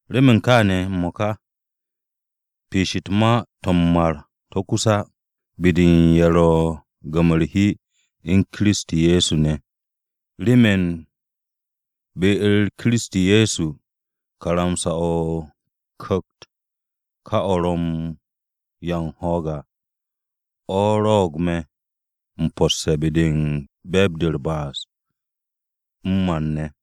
Remen kaane̱ m-mo̱ka, piish u̱t-ma to̱ m-mar to̱ kus á, be-de u̱n ye̱ ro̱ u̱n gam-o̱ u̱r-hi u̱n Kiristi Ye̱so ne̱ à. Remen be-u̱r Kiristi Ye̱so, karamsa-o̱ o-Ku̱kt ka o̱ ro̱ u̱n 'ya u̱n ho̱o̱g à, o̱ rwo̱'o̱g me̱ m-posse̱ be-de u̱n be̱e̱b-de u̱r-ba'as m-mar ne̱.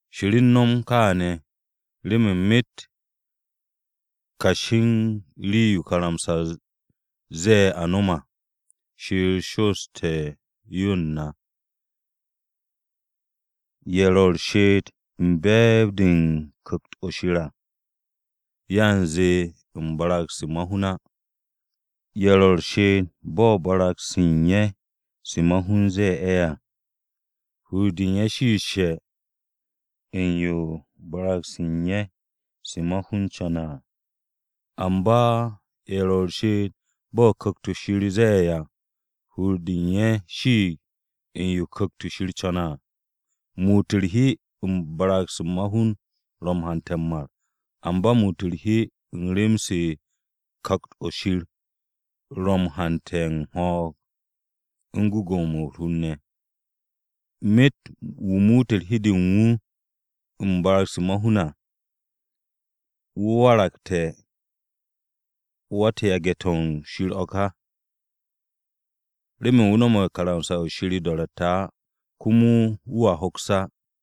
Shir u̱n no̱m kaane̱, remen myet kashi u̱n rii-yo karamsa-o ze̱e̱ a nom à, Shir shoosté̱ yo u̱n na, ye̱ ro̱ u̱r-she'et u̱n be̱e̱b-de u̱n Ku̱kt-o̱ Shir à, yanze u̱n barag-se ma-hun á. Ye̱ ro̱ u̱r-she'et bo̱ barag-se u̱n ye̱ se ma-hun ze̱e̱ ye̱ à, hur-de u̱n ye̱ shiishe̱ u̱n yo barag-se u̱n ye̱ se ma-hun co̱ne̱ à. Amba ye̱ ro̱ u̱r-she'et bo̱ Ku̱kt-o Shir ze̱e̱ ye̱ à, hur-de u̱n ye̱ shiig u̱n yo Ku̱kt-o̱ Shir co̱ne̱ à. Muut u̱r-hi u̱n barag-se ma-hun ro̱ u̱n hante̱ m-mar, amba muut u̱r-hi u̱n rem-se Ku̱kt-o̱ Shir ro̱ u̱n hante̱ u̱n ho̱o̱g, u̱n gwu̱gwu̱-mo̱ u̱r-hur ne̱. Myet wu̱ muute̱ hi-de u̱n wu̱ u̱n barag-se ma-hun ne̱ à, wu̱ waragte̱ wa-u̱t-yage̱ to̱ Shir o̱ ká. Remen wu̱ no̱me̱ karamsa-o̱ Shir o-do̱ro̱tte̱ á, komo wu̱a hoks á.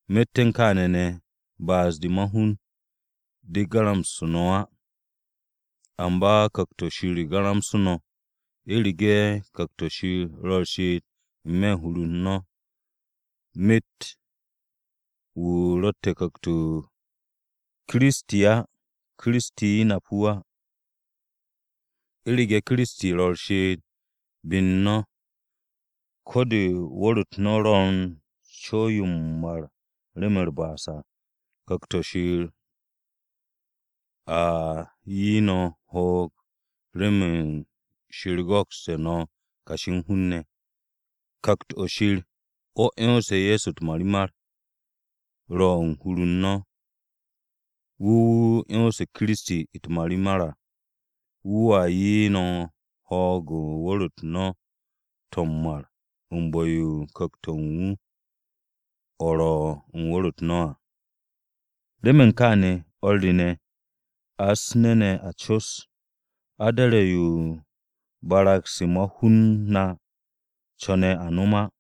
Myet u̱n kaane̱ ne̱, ba'as-de ma-hun de garamsu̱ no̱ á. Amba Ku̱kt-o̱ Shir o̱ garamsu̱ no̱, u̱rege̱ Ku̱kt-o̱ Shir ro̱ u̱r-she'et n-me̱ hur u̱n no̱. Myet wu̱ ro̱tte̱ Ku̱kt-o Kiristi á, Kiristi nap wu̱ á. U̱rege̱ Kiristi ro̱ u̱r-she'et be-u̱r no̱, ko̱ de wu̱r-u̱t no̱ ro̱ u̱n co̱w-yo m-mar remen u̱r-ba'as à, Ku̱kt-o̱ Shir a 'ye no̱ ho̱o̱g remen Shir go̱kste̱ no̱ kashi u̱n hun-ne̱. Ku̱kt-o̱ Shir, o̱ 'yonse̱ Ye̱so u̱t-marimar, ro̱ u̱n hur-u̱r no̱. Wu̱ wu̱ 'yonse̱ Kiristi u̱t-marimar à, wu̱a 'ye no̱ ho̱o̱g u̱n wu̱r-u̱t no̱ to̱ m-mar u̱n bu̱-yo u̱n Ku̱kt-o̱ u̱n wu̱ o̱ ro̱ u̱n wu̱r-u̱t no̱ à. Remen kaane̱, o̱r re ne̱, a u̱s-nu̱ ne̱ a sew, a do̱re̱ yo barag-se ma-hun na co̱ne̱ a no̱m á.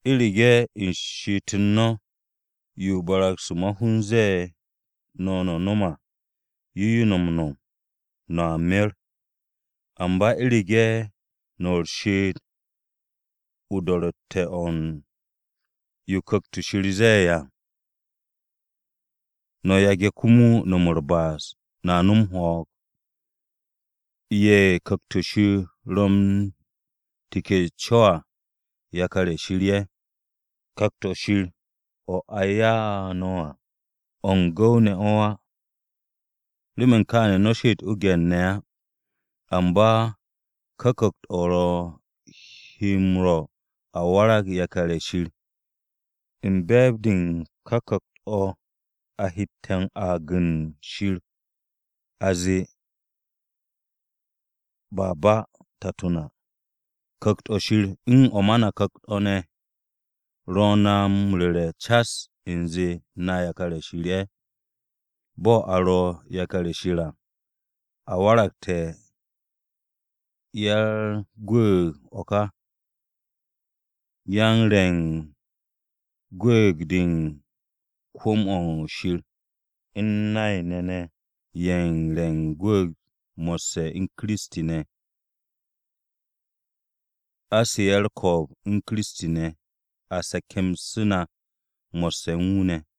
U̱rege̱ u̱n she'et-u̱r no̱, yo barag-se ma-hun ze̱e̱ no̱ no̱ no̱m à, yo no̱ m-no̱m, no̱a mer. Amba u̱rege̱ no̱ u̱n she'et-de o-do̱ro̱tte̱ o̱ u̱n yo Ku̱kt-o̱ Shir ze̱e̱ à, no̱ yage̱ komo no̱m u̱r-ba'as, no̱a no̱m ho̱o̱g. Ye̱ Ku̱kt-o̱ Shir ro̱ u̱n teke̱ co à, yakar-ye̱ Shir ye̱. Ku̱kt-o̱ Shir o̱ a ya'u̱ no̱ à, o̱ u̱n gu̱w-ne̱ o̱ á, remen kaane̱ no̱ she'et o-gye̱r ne̱ á. Amba ka Ku̱kt-o̱ o̱ he na m-rwo̱ a waragte̱ yakar-ye̱ Shir, u̱n be̱e̱b-de u̱n ka Ku̱kt-o̱ a hette̱ aag u̱n Shir a zee, “Abba! Tato na.” Ku̱kt-o̱ Shir u̱n o̱ ma na ku̱kt-o̱ ne̱ ro̱ na m-ru̱re̱ cas u̱nze na yakar-ye̱ Shir ye̱. Bo̱ a ro̱ yakar-ye̱ Shir à, a waragte̱ ya-u̱r-gwu̱u̱g o̱ ka. Yan-re̱ u̱n gwu̱u̱g-de u̱n kwu̱m-o̱ Shir, u̱n nay-ne̱ ne̱ ye̱ u̱n re̱ u̱r-gwu̱u̱g mo̱sse̱ u̱n Kiristi ne̱. A su̱'e̱ u̱r-ko̱o̱b u̱n Kiristi ne̱, a se̱ke̱msu̱ na mo̱sse̱ u̱n wu̱ ne̱.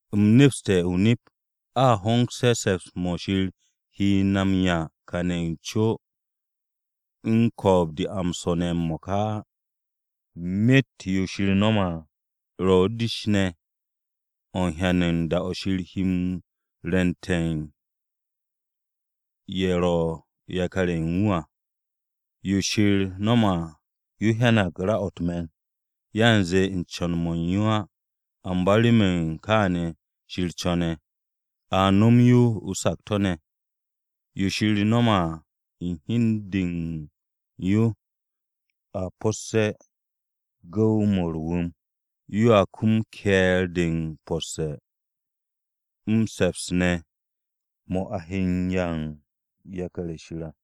U̱m nepste̱ o-nip, a hongse̱ se̱ps-mo̱ Shir he na m-'ya kane̱ n-co u̱n ko̱o̱b-de a m-swo̱ ne̱ m-mo̱ka á. Myet yo Shir no̱me̱ à, ro̱ u̱n o-dish ne̱ o̱ m-hyan u̱n da-o̱ Shir he m-rwu̱nte̱ u̱n ye̱ ro̱ yakar-ye̱ u̱n wu̱ à. Yo Shir no̱me̱ à, yo hyanag ra-o̱ u̱t-me̱n, yanze u̱n co̱n-mo̱ u̱n yo á, amba remen kaane̱ Shir co̱ne̱, a no̱m yo o-sakto̱ ne̱. Yo Shir no̱me̱ à u̱n hi u̱n de u̱n yo a po̱sse̱ u̱n gu̱w-mo̱ u̱r-wu̱m, yoa kum u̱r-ke̱e̱r de m-po̱sse̱ m-se̱ps ne̱ mo̱ a he m-'ya u̱n yakar-ye̱ Shir à.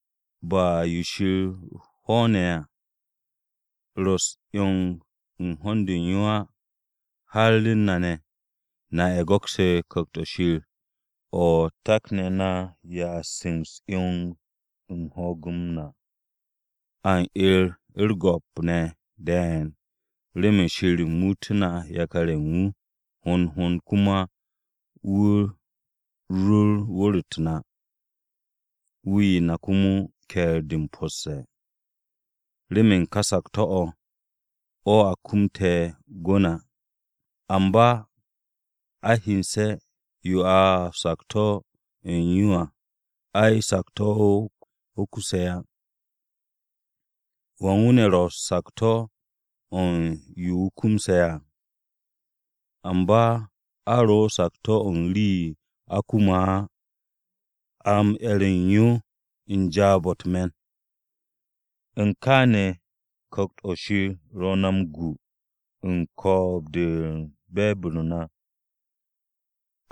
Ba yo Shir hwo̱o̱ne̱ à ro̱ u̱s-'yong u̱n ho̱n-de u̱n yo á, har u̱n na ne̱. Na ye̱ go̱kse̱ Ku̱kt-o̱ Shir o̱ a takne̱ na m-ya'a a u̱s-'yong u̱n ho̱o̱g-m na, a u̱r-'er u̱r-go̱p ne̱ de̱e̱n remen Shir muutú̱ na yakar-ye̱ u̱n wu̱ hond hond komo wu̱ rur wu̱r-u̱t na, wu̱ 'ye na komo ke̱e̱r-de m-posse̱. Remen ka sakto̱-o̱ o̱ a kumte̱ gwu̱ na. Amba a hyense̱ yo a o-sakto̱ u̱n yo à, ai, sakto̱-o̱ o̱ kuse̱ á. ¿Wan wu̱ ne̱ ro̱ sakto̱-o̱ u̱n yo wu̱ kumse̱ à? Amba a ro̱ u̱n sakto̱ u̱n rii-yo a kume̱ á, a m-'er u̱n yo u̱n jaab-o̱ u̱t-me̱n. U̱n kaane̱ Ku̱kt-o̱ Shir ro̱ na m-gu u̱n ko̱o̱b-de u̱n be̱e̱b-u̱r na.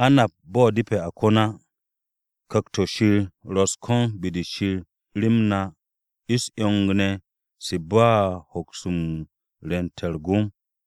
A nap bo̱ depe̱ a ko̱n á, Ku̱kt-o̱ Shir ro̱ u̱s-ko̱n be-de Shir rem na u̱s-'yong ne̱ se ba u̱n hoks m-rwu̱nte̱ u̱t-gom.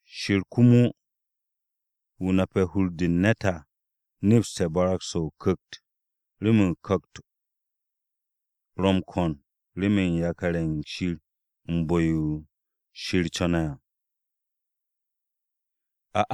Shir komo, wu̱ nape̱ hur-de u̱n ne̱t à, nepste̱ barag-se o-Ku̱kt, remen Ku̱kt-o ro̱ m-ko̱n remen yakar-ye̱ Shir u̱n bu̱-yo Shir co̱ne̱ à.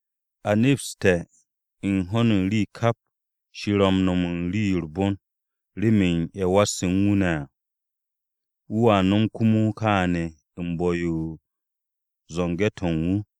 A nepste̱ u̱n ho̱n u̱n rii kap Shir ro̱ u̱n no̱m u̱n rii-yo u̱r-bon, remen ye̱ wasse̱ u̱n wu̱ ne̱ à. Wu̱a no̱m komo kaane̱ u̱n bu̱-yo u̱n zo̱nge̱-to̱ u̱n wu̱.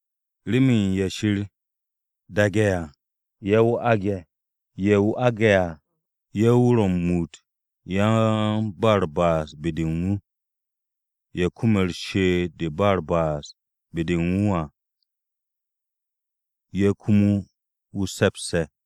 Remen ye̱ Shir daage̱ à, ye̱ wu̱ aage̱. Ye̱ wu̱ aage̱ à, ye̱ wu̱ ro̱ m-muut yan-ba-u̱r-ba'as be-de u̱n wu̱. Ye̱ kume̱ she'et-de u̱n ba u̱r-ba'as be-de u̱n wu̱ à, ye̱ ye̱ komo wu̱ se̱pse̱.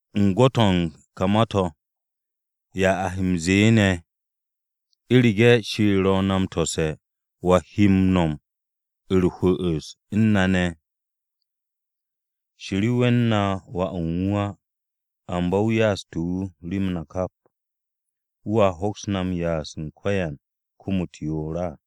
U̱n gwo̱t-o̱ u̱n ka ma-to̱, ¿ya a he m-ze̱e̱ ne̱? ¿U̱rege̱ Shir ro̱ na m-tose̱ wa he no̱m u̱r-hwu̱'u̱s u̱n na ne̱? Shir we̱n na Wà u̱n wu̱ à, amba wu̱ ya'astu̱ wu̱ rem na kap. ¿Wu̱a hoks na ya'as u̱n ko̱yan kom-u̱t yoor á?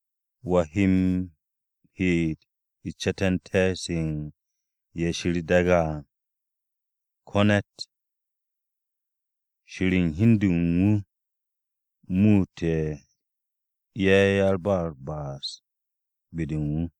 ¿Wa he m-heet u̱s-ce̱te̱nte̱ se u̱n ye̱ Shir daage̱ à? Ko̱ ne̱t! Shir u̱n hi u̱n de u̱n wu̱ muute̱ ye̱ yan-ba-u̱r-ba'as be-de u̱n wu̱.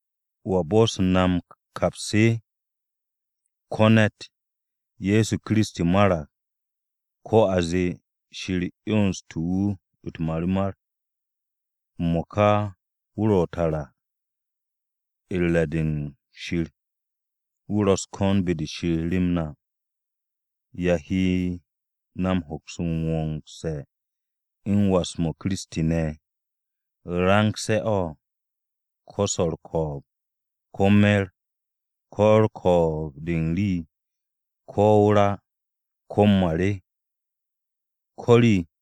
¿Wa bo̱'o̱se̱ na m-kaps? Ko̱ ne̱t! Ye̱so Kiristi marag, ko̱ a zee, Shir 'yonste̱ wu̱ u̱t-marimar, m-mo̱ka wu̱ ro̱ tara u̱r-re̱ de Shir. Wu̱ ro̱ u̱s-ko̱n be-de Shir rem na. ¿Ya he na m-wongse̱ u̱n was-m Kiristi ne̱? ¿Range̱-o̱? ¿Ko̱ swo̱ u̱r-ko̱o̱b, ko̱ me̱r, ko̱ ko̱o̱b-de u̱n rii, ko̱ o-ra, ko̱ m-mar? Ko̱ rii!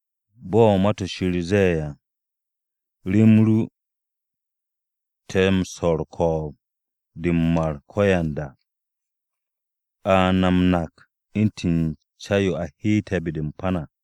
Bo̱ Ma-to̱ Shir ze̱e̱ à, “Rem ru te̱ m-swo̱ u̱r-ko̱o̱b de m-mar ko̱yanda. A na m-nak u̱ntu̱n ca-yo a heete̱ be-de u̱n pan à.”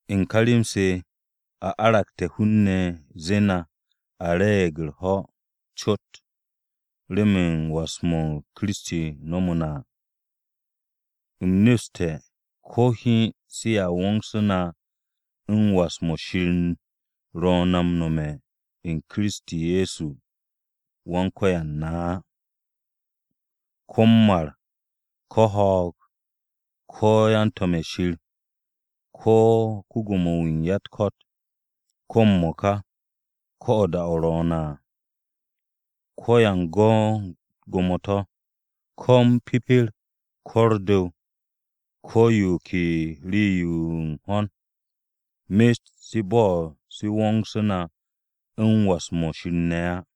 U̱n ka rem-se a argu̱te̱ hun-ne̱ zee na, a re̱e̱g u̱r-ho̱ cot remen was-mo̱ Kiristi wasse̱ na à. U̱m nepste̱ ko̱ hiin sea wo̱o̱ngsu̱ na u̱n was-mo̱ Shir ro̱ na m-was u̱n Kiristi Ye̱so Wan-Ko̱yan na á: ko̱ m-mar, ko̱ ho̱o̱g, ko̱ yan-to̱m-ye̱ Shir, ko̱ ko-Gwo̱mo-wu̱ u̱n ya-u̱t-ko̱t, ko̱ m-mo̱ka, ko̱ da-o̱ ro̱o̱ne̱ à, ko̱ yan-go̱ u̱n gwo̱mo-to̱, ko̱ m-pipir, ko̱ u̱r-du̱w, ko̱ yo ken rii-yo u̱n ho̱n, myet se bo'os se wo̱ngse̱ na u̱n was-mo̱ Shir ne̱ á.